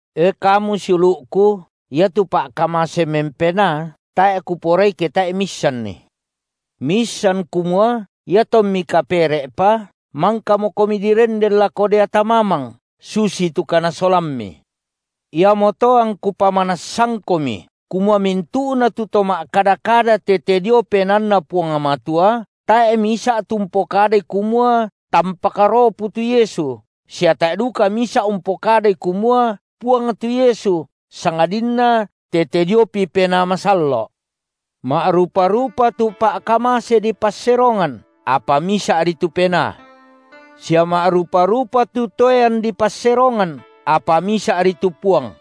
E kamu siulu’ku, iatu pa’kamase mempenaa, tae’ kuporai ke tae’i miissanni. Miissan kumua iatommi kapere’pa, mangkamokomi direnden lako deata mamang, susitu kanasolammi. Iamoto angku pamanassangkomi, kumua mintu’na tu to ma’kada-kada tete dio PenaanNa Puang Matua, tae’ misa’ tu umpokadai kumua tampak ropu tu Yesu, sia tae’ duka misa’ umpokadai kumua, Puang tu Yesu, sangadinna tete diopi Penaa Masallo’. Ma’rupa-rupa tu pa’kamase dipasserongan, apa misa’ri tu Penaa. Sia ma’rupa-rupa tu toean dipasserongan, apa misa’ri tu Puang.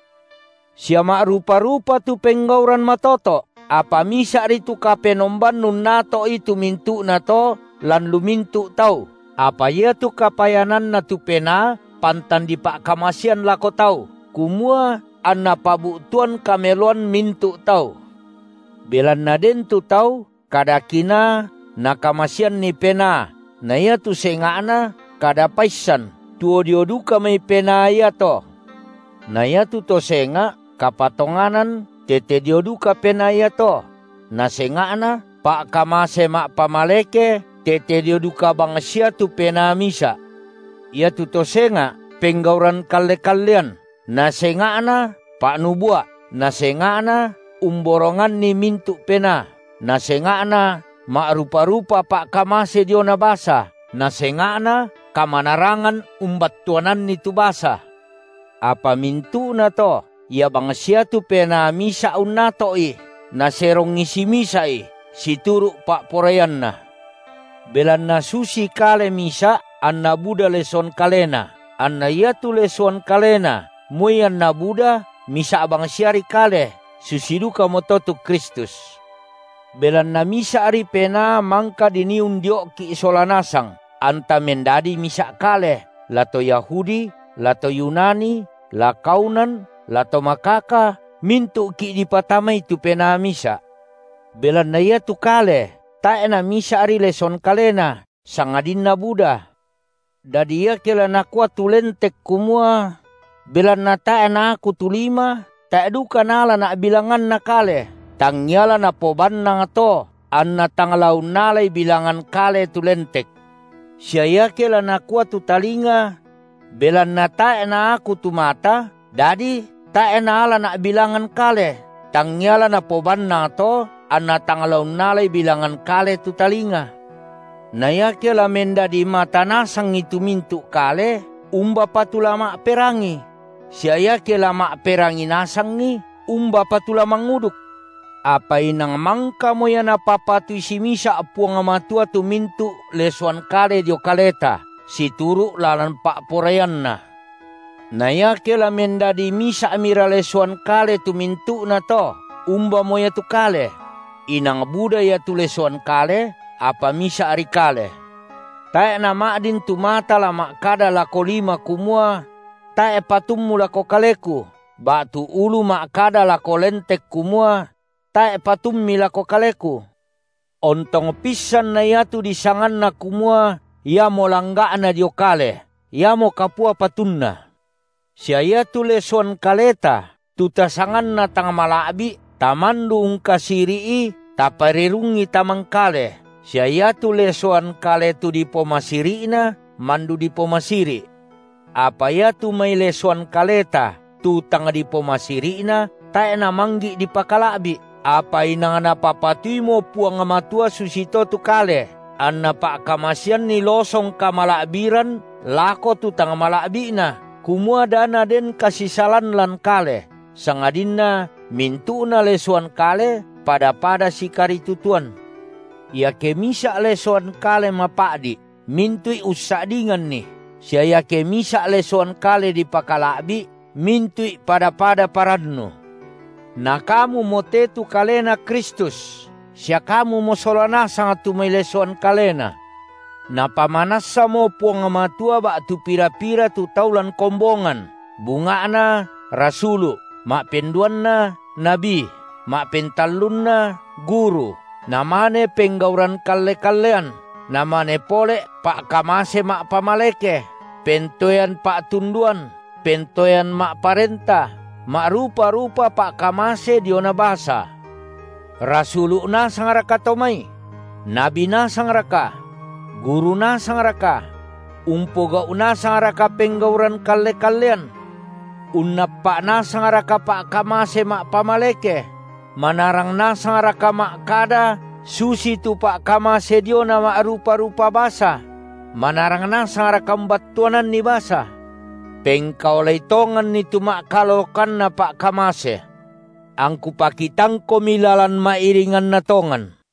Sia ma’rupa-rupa tu penggauran matoto’, apa Misa’ri tu Kapenomban unnato’i tu mintu’nato lan lu mintu’ tau, apa iatu kapayananna tu Penaa pantan dipa’kamasean lako tau, kumua anna pabu’tuan kameloan mintu’ tau. Belanna den tu tau kada Kinaa, Nakamaseanni Penaa na iatu senga’na kada paissan, tuo dio duka mai Penaa iato. Na iatu to senga’, kapatonganan tete dio duka Penaa iato; na senga’na, pa’kamase ma’pamaleke tete dio duka bangsia tu Penaa misa’. Iatu to senga’ penggauran kalle-kallean, na senga’na pa’nubua’, na senga’na umboronganni mintu’ penaa, na senga’na ma’rupa-rupa pa’kamase diona basa, na senga’na kamanarangan umbattuananni tu basa. Apa mintu’nato, Ia bangsia tu Penaa misa’ unnato’i, Naserongi simisa’i situru’ pa’poraianNa. Belanna susi kale misa’, anna buda lesoan kalena, anna iatu lesoan kalena moi anna buda, misa’ bangsiari kale, susi dukamoto tu Kristus. Belanna misa’ri Penaa mangka dinii undio’ki’ sola nasang anta mendadi misa’ kale, la to Yahudi, la to Yunani, la kaunan, la to makaka; mintu’ki’ dipatamai tu Penaa misa’. Belanna iatu kale tae’ namisa’ri lesoan kalena, sangadinna buda. Dadi iake la nakua tu lentek kumua: Belanna tae’ naaku tu lima, tae’ duka naalana’ bilanganna kale, tangngia la napobannang to anna tang la unnalai bilangan kale tu lentek. Sia iake la nakua tu talinga: Belanna tae’ naaku tu mata, dadi tae’ naalana’ bilanganna kale, tangngia la napobannang to anna tang la unnalai bilangan kale tu talinga. Na iake la mendadi mata nasangi tu mintu’ kale, umbapa tu la ma’perangi? Sia iake la ma’perangi nasangi, umbapa tu la manguduk? Apa inang mangkamo ia Napapatui simisa’ Puang Matua tu mintu’ lesoan kale dio kaleta, situru’ lalan pa’poraianNa. Na iake la mendadi misa’mira lesoan kale tu mintu’nato, umbamo ia tu kale? Inang buda ia tu lesoan kale, apa misa’ri kale. Tae’ nama’din tu mata la ma’kada lako lima kumua: Tae’ patummu lako kaleku, ba’tu ulu ma’kada lako lentek kumua: Tae’ patummi lako kaleku. Ontong pissan na iatu disanganna kumua iamo langga’na dio kale, iamo kapua patunna. Sia iatu lesoan kaleta, tu tasanganna tang mala’bi’, tamandu ungkasiri’i taparerungi tamangkale, sia iatu lesoan kale tu dipomasiri’na mandu dipomasiri’. Apa iatu mai lesoan kaleta tu tang dipomasiri’na, tae’ namanggi’ dipakala’bi’, apa inang Napapatuimo Puang Matua susito tu kale, anNa pa’kamaseanni losong kamala’biran lako tu tang mala’bi’na, kumua da naden kasisalan lan kale, sangadinna mintu’na lesoan kale pada-pada sikaritutuan. Iake misa’ lesoan kale mapa’di’, mintu’i ussa’dinganni, sia iake misa’ lesoan kale dipakala’bi’, mintu’i pada-pada parannu. Na kamumo te tu kaleNa Kristus, sia kamumo sola nasang tu mai lesoan kaleNa. Napamanassamo Puang Matua ba’tu pira-pira tu tau lan kombongan, bunga’na rasulu’, ma’penduanna nabi, ma’pentallunna guru, namane penggauran kalle-kallean, namane pole’ pa’kamase ma’pamaleke, pentoean pa’tunduan, pentoean ma’parenta, ma’rupa-rupa pa’kamase diona basa. Rasulu’ nasangraka to mai? Nabi nasangraka? Guru nasangraka? Umpogau’ nasangraka penggauran kalle- kallean? Unnappa’ nasangraka pa’kamase ma’pamaleke? Manarang nasangraka ma’kada susitu pa’kamase diona ma’rupa-rupa basa? Manarang nasangraka umbattuananni basa? Pengkaolai tonganni tu ma’kalolokanna pa’kamase. Angku pakitangkomi lalan ma’iringanna tongan.